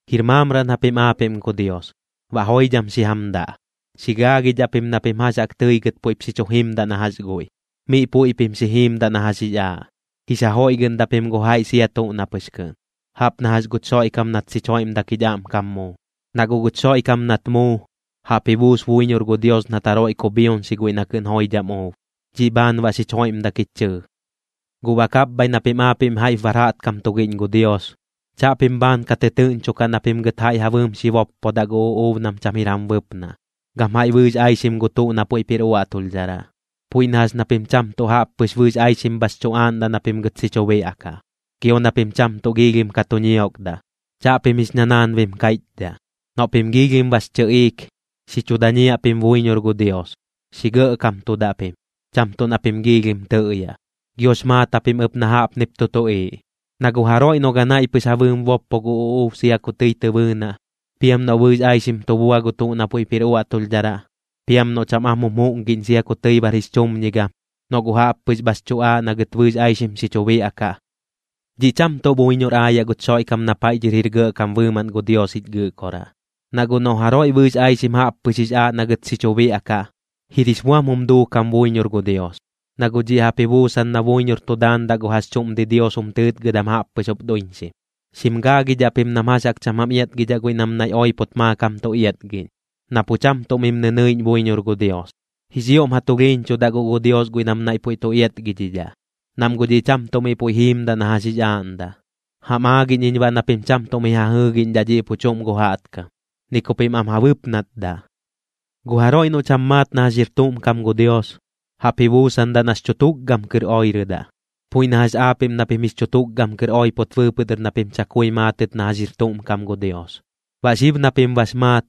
Jir maamraꞌn japim aapiꞌm gu Dios, baꞌ joidham xi jam daꞌ. Xi gaagidhaꞌ pim na pim jax jaꞌk tɨi gɨt puiꞌp xi chu jimdaꞌ na jax guiꞌ, miꞌ puiꞌ pim xi jiimdaꞌ na jax jix aaꞌ. Jix ja joiꞌgɨꞌndaꞌ pim gu jaiꞌ sia tuꞌ na pɨx kɨꞌn, jaꞌp na jax guch Xoiꞌkam nat xich joiꞌmdak jich aꞌmkam muu. Na guꞌ guch Xoiꞌkam nat muu, jaꞌp ji buus buiñor gu Dios nat jaroiꞌ kubhioñxi guiꞌ na kɨꞌn joidham uub. Dhiꞌ bhaan baꞌ xich joiꞌmdak jich chɨɨ. Guꞌ baꞌ kapbhaiꞌ na pim aapiꞌm jaiꞌp bar jaꞌtkam tugiꞌñ gu Dios, chaꞌpim bhaan ka tɨtɨɨꞌñchokaꞌ na pim gɨt jaiꞌ ja bɨɨm xi boppodaꞌ gu uꞌuub nam cham jir jam bɨpnaꞌ, gam jaiꞌ bɨɨx aixim gu tuꞌ na puiꞌp jir uaꞌtulhdharaꞌ, puiꞌ na jax ña pim cham tuꞌ jaꞌp pɨx bɨɨx aixim bhax chu aaꞌndaꞌ na pim gɨt xi chu biaꞌkaꞌ. Gio na pim cham tuꞌ giilhim ka tu ñiokdaꞌ. Chaꞌpim jix ñanaanbim kaiꞌchdhaꞌ. Noꞌ pim giilhim bax chɨꞌiik, xi chu dañiaꞌ pim buiñor gu Dios, xi gɇꞌkamtudaꞌ pim, cham tuꞌ na pim giilhim tɨꞌyaꞌ. Giox maat japim ɨp na jaꞌpnip tu tuꞌiiꞌ: Na gu jaroiꞌ noꞌ ganaiꞌ pɨx ja bɨɨm boppo gu uꞌuub sia ku tɨi tɨ bɨɨnaꞌ, piam noꞌ bɨɨx aixim tu bua gu tuꞌ na puiꞌp jir uaꞌtulhdharaꞌ, piam noꞌ cham am jum juꞌngiꞌñ sia ku tɨi bar jix chumñigam, noꞌ guꞌ jaꞌp pɨx bhax chu aaꞌ na gɨt bɨɨx aixim xi chu biaꞌkaꞌ, dhiꞌ cham tuꞌ buiñor aayaꞌ guch Xoiꞌkam na paiꞌ dhɨr jir Gɇꞌkam bɨɨmaꞌn gu Dios jich Gɨꞌkoraꞌ. Na guꞌ noꞌ jaroiꞌ bɨɨx aixim jaꞌp pɨx jix aaꞌ na gɨt xi chu biaꞌkaꞌ, jir jix buam jum duukam buiñor gu Dios, na guꞌ dhiꞌ jaꞌp ji buusan na buiñor tu daandaꞌ gu jax chuꞌm didios jum tɨɨtgɨdam jaꞌppɨx jup duiñxim. Xim gaagidhaꞌ pim nam jax jaꞌk cham jam iatgidhaꞌ guiꞌ nam naiꞌ oipot maakam tu iatgiꞌñ, na pu cham tuꞌ mim nɨnɨiꞌñ buiñor gu Dios. Jix ioꞌm ja tulhiiñchudaꞌ guꞌ gu Dios guiꞌ nam naiꞌ puiꞌ tu iatgidhidhaꞌ, nam guꞌ dhiꞌ cham tuꞌ miꞌ puiꞌ jiimdaꞌ na jax jix aaꞌndaꞌ. Jam aagiꞌñ iñ baꞌ na pim cham tuꞌ mi ja jɨɨgiꞌñdhaꞌ dhiꞌ pu chuꞌm gu jaꞌtkam, ni ku pim am ja bɨpnatdaꞌ. Gu jaroiꞌ noꞌ cham maat na jax jir tuꞌm kam gu Dios, jaꞌp ji buusandaꞌ nax chu tukgam kɨr oirɨdaꞌ, puiꞌ na jax aapiꞌm na pim jix chu tukgam kɨr oipot bɨɨpɨꞌ dɨr na pim chakui maatɨt na jax jir tuꞌm kam gu Dios. Baꞌ xib na pim bax maat,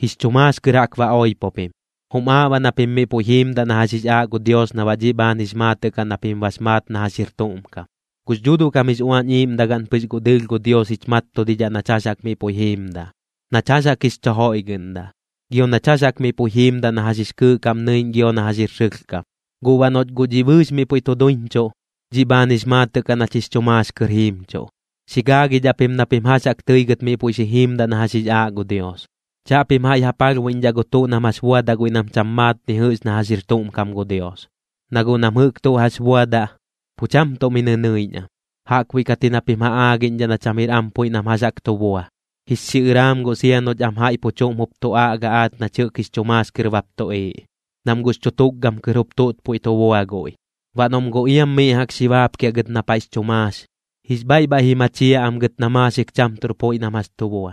jix chu maax kɨr jaꞌk ba oipo pim, jum aaꞌ baꞌ na pim miꞌ puiꞌ jiimdaꞌ na jax jix aaꞌ gu Dios na baꞌ dhiꞌ bhaan jix maatɨꞌ kaꞌ na pim bax maat na jax jir tuꞌm kam. Gux Dhuuduꞌ kam jix Uañ Iiꞌmdagaꞌn pɨx guꞌ dɨɨlh gu Dios jich mattudidhaꞌ nach jax jaꞌk miꞌ puiꞌ jiimdaꞌ, nach jax jaꞌk jix chu joiꞌgɨꞌndaꞌ, gio nach jax jaꞌk miꞌ puiꞌ jiimdaꞌ na jax jix kɨɨꞌ kaꞌm nɨiꞌñ gio na jax jir sɨlhkam. Guꞌ baꞌ noꞌch guꞌ dhiꞌ bɨɨx miꞌ puiꞌ tu duiñchuꞌ, dhiꞌ bhaan jix maatɨꞌ kaꞌ nach jix chu maax kɨr jiimchuꞌ. Xi gaagidhaꞌ pim na pim jax jaꞌk tɨi gɨt miꞌ puiꞌ xi jiimdaꞌ na jax jix aaꞌ gu Dios. Chaꞌpim jaiꞌ ja palhbuiꞌñdhaꞌ gu tuꞌ nam jax buadaꞌ guiꞌ nam cham maat ni jɨꞌx na jax jir tuꞌm kam gu Dios, na guꞌ nam jɨꞌk tuꞌ jax buadaꞌ, pu cham tuꞌ mi nɨnɨiꞌñ am. Jaꞌkbuiꞌ kat ji na pim ja aagiꞌñdhaꞌ na cham jir am puiꞌ nam jax jaꞌk tu bua. Jix xiꞌɨraam guꞌ sia noꞌch am jaiꞌ pu chuꞌm jup tu aꞌga aach nach jɨꞌk jix chu maax kɨr bap tuꞌiiꞌ, nam guꞌx chu tukgam kɨr jup tuꞌt puiꞌ tu bua guiꞌ. Baꞌ noꞌm guꞌ iam miꞌ jaꞌk xi baapkiaꞌ gɨt na paiꞌx chu maax, jix bhaiꞌ bhaiꞌ ji machiaꞌ am gɨt na maaxik cham tuꞌr puiꞌ nam jax tu bua,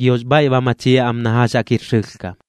giox bhaiꞌ ba machiaꞌ am na jax jaꞌk jir sɨlhkam.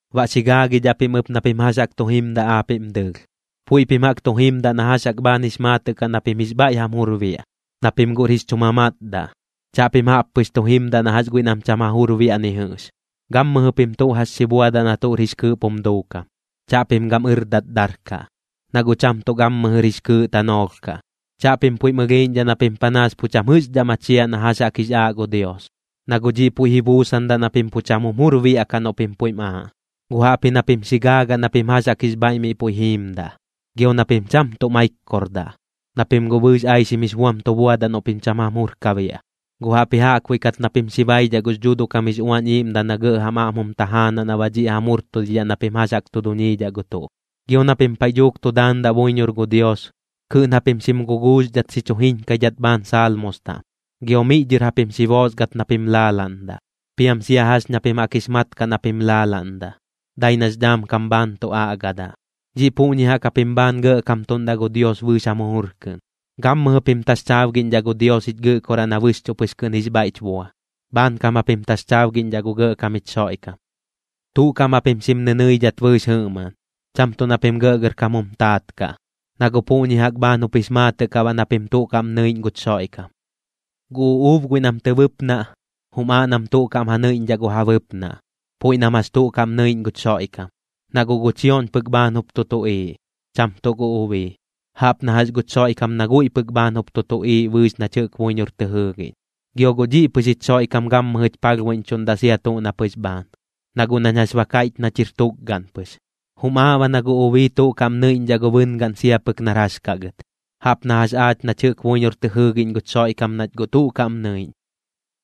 Baꞌ xi gaagidhaꞌ pim ɨp na pim jax jaꞌk tu jimdaꞌ aapiꞌm dɨɨlh. Puiꞌ pim jaꞌk tu jimdaꞌ na jax jaꞌk bhaan jix maatɨꞌ kaꞌ na pim jix bhaiꞌ jam jur biaꞌ, na pim guꞌr jix chu mamatdaꞌ. Chaꞌpim jaꞌp pɨx tu jimdaꞌ na jax guiꞌ nam cham ja jur biaꞌ ni jɨꞌx. Gammɨjɨ pim tuꞌ jax xi buadaꞌ na tuꞌr jix kɨɨꞌp jum duukam, chaꞌpim gam ɨrdat darkaꞌ, na guꞌ cham tuꞌ gammɨjɨr jix kɨɨꞌ tanoolh kaꞌ. Chaꞌpim puiꞌm ɨlhiiꞌñdhaꞌ na pim panaas pu cham jɨꞌxdhaꞌ machiaꞌ na jax jaꞌk jix aaꞌ gu Dios, na guꞌ dhiꞌ puiꞌ ji buusandaꞌ na pim pu cham jum jur biaꞌkaꞌ noꞌ pim puiꞌm aaꞌ, guꞌ jaꞌpji na pim xi gaagaꞌ na pim jax jaꞌk jix bhaiꞌ miꞌ puiꞌ jiimdaꞌ. Gio na pim cham tuꞌ maikkordaꞌ, na pim guꞌ bɨɨx aixim jix buam tu buadaꞌ noꞌ pim cham jam jur ka biaꞌ, guꞌ jaꞌpji jaꞌkbuiꞌ kat na pim xi baidhaꞌ gux Dhuuduꞌ kam jix Uañ Iiꞌmdaꞌ na gɇꞌ jam aꞌm jum tajaanaꞌ na baꞌ dhiꞌ jam jurtudidhaꞌ na pim jax jaꞌk tu duñiidhaꞌ gu tuꞌ. Gio na pim paiꞌ dhuuk tu daandaꞌ buiñor gu Dios, kɨꞌn japim xim guguuxdhat xi chu jiñkaidhat bhaan Saalmos taꞌm, gio miꞌ dhɨr japim xi boosgat na pim laalaꞌndaꞌ, piam sia jax ña pim jaꞌk jix mat kaꞌ na pim laalaꞌndaꞌ, dai nax dhaam kam bhaan tu aꞌgadaꞌ. Dhiꞌ puꞌñi jaꞌk japim bhaan gɇꞌkamtuꞌndaꞌ gu Dios bɨɨx jam jujur kɨꞌn. Gammɨjɨ pim taxchaabgiꞌñdhaꞌ gu Dios jich Gɨꞌkoraꞌ na bɨxchuꞌ pɨx kɨꞌn jix bhaiꞌch bua, bhaankam japim taxchaabgiꞌñdhaꞌ gu Gɇꞌkam jich Xoiꞌkam. Tuꞌ kaꞌm japim xim nɨnɨidhat bɨɨx jɨꞌmaꞌn, cham tuꞌ na pim gɇꞌgɇrkam jum taat kaꞌ, na guꞌ puꞌñi jaꞌk bhaan jup jix maatɨꞌ kaꞌ baꞌ na pim tuꞌ kaꞌm nɨiꞌñ guch Xoiꞌkam. Gu uꞌuub guiꞌ nam tɨ bɨpnaꞌ, jum aaꞌ nam tuꞌ kaꞌm ja nɨiꞌñdhaꞌ gu ja bɨpnaꞌ, puiꞌ nam jax tuꞌ kaꞌm nɨiꞌñ guch Xoiꞌkam. Na guꞌ gu chioꞌñ pɨk bhaan jup tu tuꞌiiꞌ, cham tuꞌ gu ubii. Jaꞌp na jax guch Xoiꞌkam na guiꞌ pɨk bhaan jup tu tuꞌiiꞌ bɨɨx nach jɨꞌk buiñor tɨ jɨɨgiꞌñ. Gio guꞌ dhiꞌ pɨx jich Xoiꞌkam gammɨjɨch palhbuiꞌñchuꞌndaꞌ sia tuꞌ na pɨx bhaan, na guꞌ nañ jax ba kaiꞌch nach jir tukgaꞌn pɨx. Jum aaꞌ baꞌ na gu ubii tuꞌ kaꞌm nɨiꞌñdhaꞌ gu bɨngaꞌn sia pɨk nar jax kaꞌ gɨt, jaꞌp na jax aach nach jɨꞌk buiñor tɨ jɨɨgiꞌñ guch Xoiꞌkam nach guꞌ tuꞌ kaꞌm nɨiꞌñ.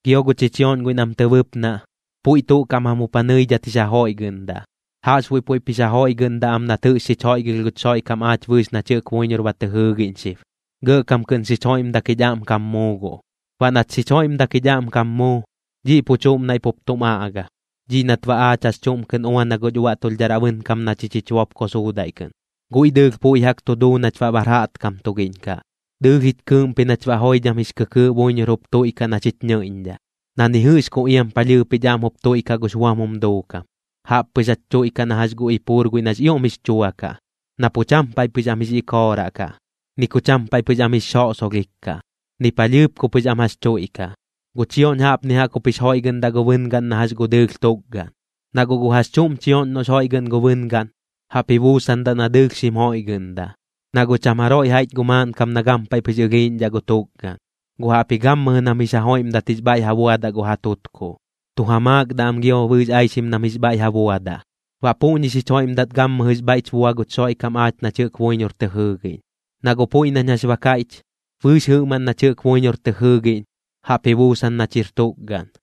Gio gu chichioꞌñ guiꞌ nam tɨ bɨpnaꞌ, puiꞌ tuꞌ kaꞌm jam jup ja nɨidhat jix ja joiꞌgɨꞌndaꞌ, jaꞌxbuiꞌ puiꞌp jix ja joiꞌgɨꞌndaꞌ am nat jɨꞌx xich joiꞌgɨlh guch Xoiꞌkam aach bɨɨx nach jɨꞌk buiñor ba tɨ jɨɨgiꞌñ xib. Gɇꞌkam kɨꞌn xich joiꞌmdak jich aꞌmkam muu guꞌ. Baꞌ nat xich joiꞌmdak jich aꞌmkam muu, dhiꞌ pu chuꞌm naiꞌ pup tum aꞌga, dhiꞌ nat baꞌ aach jax chuꞌm kɨꞌn uana guch uaꞌtulhdharaꞌ bɨnkam na chich jich bopko suudaiꞌ kɨꞌn. Guiꞌ dɨɨlh puiꞌ jaꞌk tu duu nach baꞌ bar jaꞌtkam tugiꞌñ kaꞌ, dɨɨlh jich kɨɨꞌmpi nach baꞌ joidham jix kɨkɨɨꞌ buiñor jup tuiꞌkaꞌ na xich nɨiꞌñdhaꞌ, na ni jɨꞌx ku iam palhɨɨp jich aꞌm jup tuiꞌkaꞌ gux buam jum duukam. Jaꞌp pɨx jach tuiꞌkaꞌ na jax gu ipuur guiꞌ nax ioꞌm jix chua kaꞌ, na pu cham paiꞌ pɨx am jix ikooraꞌ kaꞌ, ni ku cham paiꞌ pɨx am jix xoꞌsolhik kaꞌ, ni palhɨɨp ku pɨx am jax tuiꞌkaꞌ. Gu chioꞌñ jaꞌpni jaꞌk jup jix joiꞌgɨꞌndaꞌ gu bɨngaꞌn na jax gu dɨɨlh tukgaꞌn. Na guꞌ gu jax chuꞌm chioꞌñ noꞌx joiꞌgɨꞌn gu bɨngaꞌn, jaꞌp ji buusandaꞌ na dɨɨlh xim joiꞌgɨꞌndaꞌ. Na guꞌ cham jaroiꞌ jaiꞌch gu maaꞌnkam na gampaiꞌ pɨx ɨlhiiꞌñdhaꞌ gu tukgaꞌn, guꞌ jaꞌpji gammɨjɨ nam jix ja joiꞌmdat jix bhaiꞌ ja buadaꞌ gu ja tutkuꞌ, tu ja maakdaꞌ am gio bɨɨx aixim nam jix bhaiꞌ ja buadaꞌ. Baꞌ puꞌñi xich joiꞌmdat gammɨjɨx bhaiꞌch bua guch Xoiꞌkam aach nach jɨꞌk buiñor tɨ jɨɨgiꞌñ. Na guꞌ puiꞌ nañ jax ba kaiꞌch, bɨɨx jɨꞌmaꞌn nach jɨꞌk buiñor tɨ jɨɨgiꞌñ, jaꞌp ji buusan nach jir tukgaꞌn.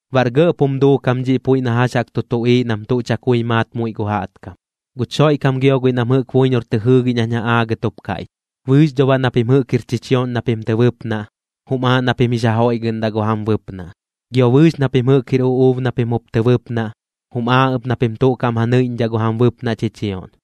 Baꞌr gɇꞌp jum duukam dhiꞌ puiꞌ na jax jaꞌk tu tuꞌiiꞌ nam tuꞌ chakui maat muiꞌ gu jaꞌtkam. Guch Xoiꞌkam gio guiꞌ nam jɨꞌk buiñor tɨ jɨɨgiꞌñ jañ ja aagɨt jup kaiꞌch. Bɨɨx dho baꞌ na pim jɨꞌk jir chichioꞌñ na pim tɨ bɨpnaꞌ, jum aaꞌ na pim jix ja joiꞌgɨꞌndaꞌ gu jam bɨpnaꞌ. Gio bɨɨx na pim jɨꞌk jir uꞌuub na pim jup tɨ bɨpnaꞌ, jum aaꞌ ɨp na pim tuꞌ kaꞌm ja nɨiꞌñdhaꞌ gu jam bɨpnaꞌ chichioꞌñ.